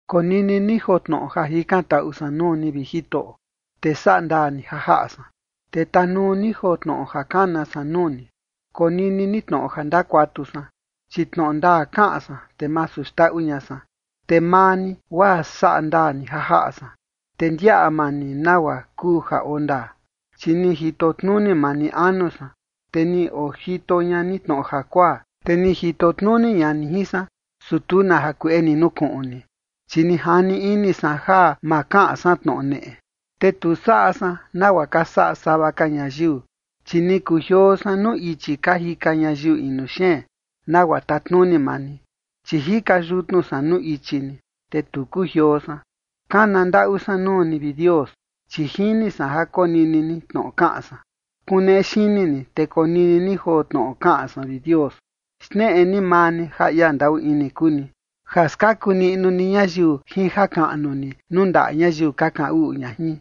Konini ni joo tnoꞌo ja jikantaꞌu san nuu ni, vi Jitoꞌo, te saꞌa ndaa ni ja jaꞌa san, te tanuu ni joo tnoꞌo ja kana san nuu ni. Konini ni tnoꞌo ja ndakuatu san, chi tnoꞌo ndaa kaꞌan san, te masu xndaꞌu ña san. Te maa ni, guaa saꞌa ndaa ni ja jaꞌa san, te ndiaꞌa maa ni nagua kuu ja oo ndaa. Chi ni jito tnuni maa ni anu san, te ni ojito ña ni tnoꞌo jakuaa. Te ni jito tnuni ña ni jin san, su tu na jakueꞌe ni nukuꞌun ni, chi ni jani ini san ja ma kaꞌan san tnoꞌo neꞌe. Te tu saꞌa san nagua ka saꞌa sava ka ñayiu, chi ni kujioo san nuu ichi ka jika ñayiu inu xeen, nagua tatnuni maa ni. Chi jika yutnu san nuu ichi ni, te tu kujioo san. Kana ndaꞌu san nuu ni, vi Dios, chi jini san ja konini ni tnoꞌo kaꞌan san. Kuneꞌe xini ni, te konini ni joo tnoꞌo kaꞌan san, vi Dios. Xneꞌe ni maa ni ja ia ndaꞌu ini kuu ni, ja skaku niꞌnu ni ñayiu jin jakaꞌnu ni nuu ndaꞌa ñayiu ka kaꞌan uꞌu ña jin,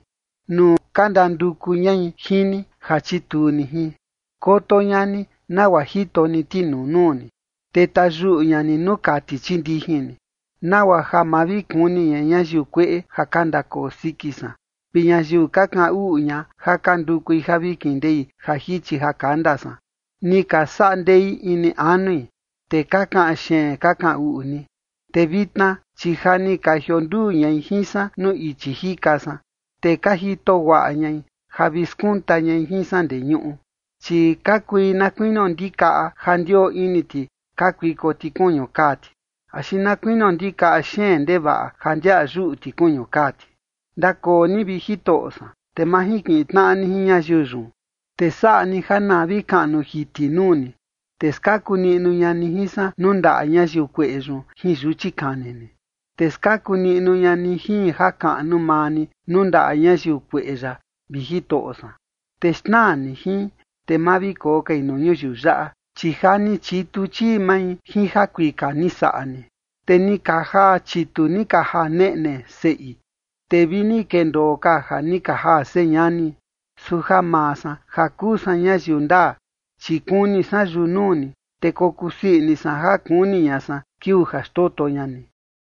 nuu ka ndanduku ñai jin ni ja chituu ni jin. Koto ña ni nagua jito ni tinuu nuu ni, te tayuꞌu ña ni nuu kati chii ndijin ni, nagua ja ma vi kuni ña ñayiu kueꞌe ja ka ndakoo siki san vi ñayiu ka kaꞌan uꞌu ña ja ka ndukui ja vi kindei ja jichi ja kanda san. Ni ka saꞌa ndei ini anui, te ka kaꞌan xeen ka kaꞌan uꞌu ni. Te vitna, chi ja ni ka jionduu ñai jin san nuu ichi jika san, te ka jito guaꞌa ñai ja vi skunta ñai jin san ndee ñuꞌu. Chi ka kui na kuinio ndikaꞌa ja ndioo ini ti kakuiko ti kuñu kaa ti, axi na kuinio ndikaꞌa xeen ndevaꞌa ja ndiaꞌa yuꞌu ti kuñu kaa ti. Ndakoo ni, vi Jitoꞌo san, te majinkiꞌin tnaꞌa ni jin ñayiu yun, te saꞌa ni ja na vi kaꞌnu jiti nuu ni, te skaku niꞌnu ña ni jin san nuu ndaꞌa ñayiu kueꞌe yun jin yuchi kani ni. Te skaku niꞌnu ña ni jin jakaꞌnu maa ni nuu ndaꞌa ñayiu kueꞌe yaꞌa, vi Jitoꞌo san, te xnaa ni jin, te ma vi koo kai nuu ñuyiu yaꞌa, chi ja ni chitu chii mai jin jakuika ni saꞌa ni, te ni ka jaa chitu ni ka jaa neꞌne seꞌi, te vi ni kendoo ka ja ni ka jaa señani. Su ja maa san ja kuu san ñayiu ndaa, chi kuni san yunuu ni, te kokusii ini san ja kuni ña san kiuu ja xndoto ña ni.